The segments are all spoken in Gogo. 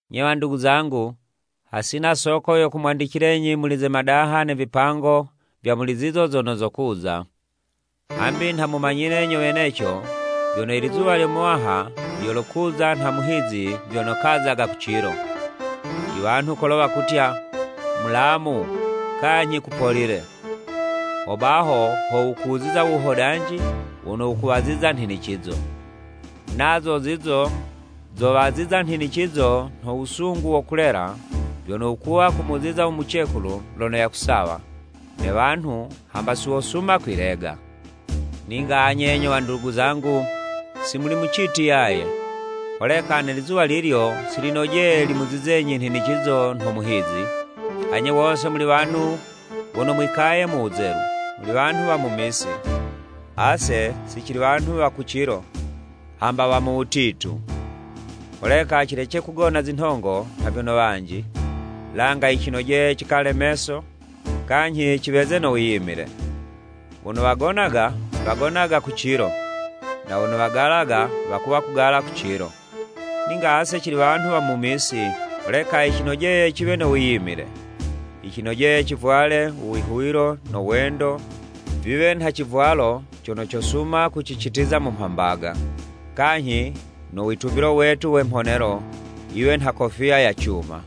Nye wandugu zangu, hasina soko yo kumwandicilenyi muli ze madaha ne vipango vya muli zizo zono zokuza. Hambi nha mumanyile nyo weneco vyono, i lizuwa lyo Muwaha lyolokuza nha muhizi vyono kazaga ku cilo. I wanhu kolo wakutya, “Mulamu kanyhi kupolile.” Hobaho ho wukuziza u wuhodanji wono wukuwaziza nhinicizo! Nazo zizo zowaziza nhinicizo nho wusungu wo kulela vyono wukuwa kumuziza u mucekulu lono yakusawa, ne wanhu hamba si wosuma kwilega. Ninga anye nyo wandugu zangu si muli mu citi yaye, holeka ne lizuwa lilyo si linojeye limuzizenyi nhinicizo nho muhizi. Anye wose muli wanhu wono mwikaye mu wuzelu, muli wanhu wa mu misi. Ase si cili wanhu wa ku cilo hamba wa mu wutitu. Holeka cilece kugona zinhongo nha vyono wanji, langa yicinojeye cikale meso kanyhi ciweze no wiyimile. Wono wagonaga, wagonaga ku cilo, na wono wagalaga, wakuwa kugala ku cilo. Ninga ase cili wanhu wa mu misi, holeka yicinojeye ciwe no wiyimile. Yicinojeye civwale u wihuwilo no wendo viwe nha civwalo cono cosuma kucicitiza mu mhambaga, kanyhi no witumbilo wetu we mhonelo, yiwe nha kofiya ya cuma.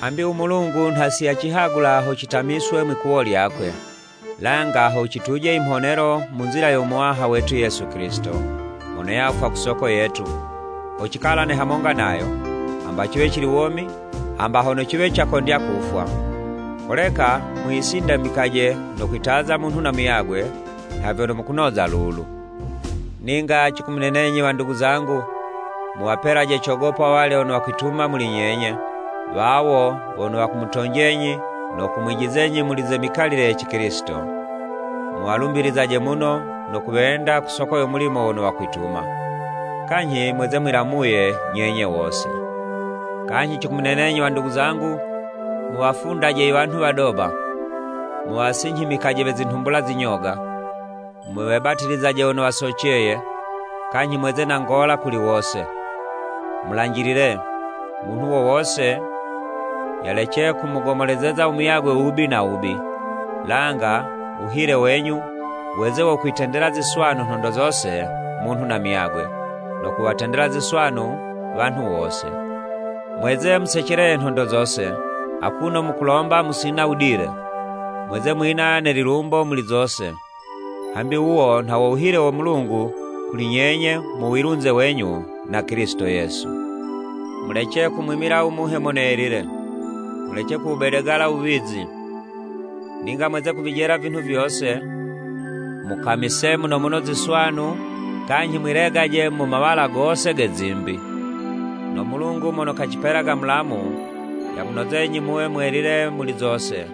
Hambi u Mulungu nha si yacihagula ho citamiswe mwi'kuwo lyakwe, langa ho ciyituje i mhonelo mu nzila yo Muwaha wetu Yesu Kilisito, mono yafwa ku soko yetu, ho cikalane hamonga nayo, hamba ciwe cili womi, hamba hono ciwe cakondya kufwa. Holeka mwisindamikaje no kwitaza munhu na muyagwe nha vyono mukunoza lulu. Ninga cikumunenenyi wandugu zangu, muwapelaje cogopo awalya wono wakwituma muli nyenye, wawo wono wakumutonjenyi no kumwijizenyi muli ze mikalile ye Cikilisito. Muwalumbizaje muno no kuwenda ku soko yo mulimo wono wakwituma. Kanyhi mweze mwilamuye nyenye wose. Kanyhi cikumunenenyi wandugu zangu, muwafundaje i wanhu wadoba, muwasinyhimikaje we zinhumbula zinyoga, muwebatilizaje wono wasoceye, kanyhi mweze na ngola kuli wose. Mulanjilile, munhu wo wose yalece kumugomolezeza u muyagwe wubi na wubi, langa wuhile wenyu, weze wo kwitendela ziswanu nhondo zose munhu na muyagwe, no kuwatendela ziswanu wanhu wose. Mweze museceleye nhondo zose, akuno mukulomba musina wudile, mweze mwina ne lilumbo muli zose. Hambi wuwo nha wo wuhile wo Mulungu kuli nyenye mu wilunze wenyu na Kilisito Yesu. Mulece kumwimila u Muhe Mono Yelile; mulece kuwubedegala wuwizi. Ninga mweze kuvijela vinhu vyose; mukamise muno muno ziswanu, kanyhi mwilegaje mu mawala gose ge zimbi. No Mulungu mono kacipelaga mulamu, yamunozenyi muwe mwelile muli zose,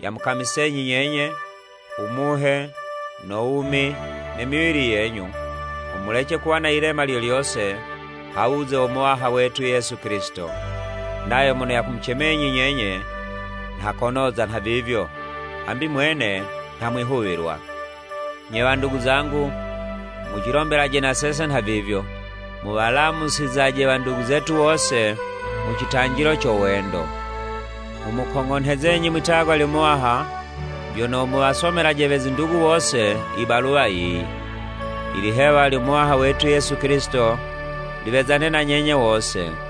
yamukamisenyi nyenye, u muhe, no wumi ne miwili yenyu, ho mulece kuwa na yilema lyo lyose ha wuze wo Muwaha wetu Yesu Kilisito. Nayo mono yamucemenyi nyenye, nha konoza nhavivyo, hambi Mwene nha mwihuwilwa. Nye wandugu zangu, mucilombelaje na sese nhavivyo. Muwalamusizaje wandugu zetu wose mu citanjilo co wendo. Nghumukong'onhezenyi mwitagwa lyo Muwaha, vyono muwasomelaje we zindugu wose i baluwa yiyi. Ilihewa lyo Muwaha wetu Yesu Kilisito, liwezane na nyenye wose.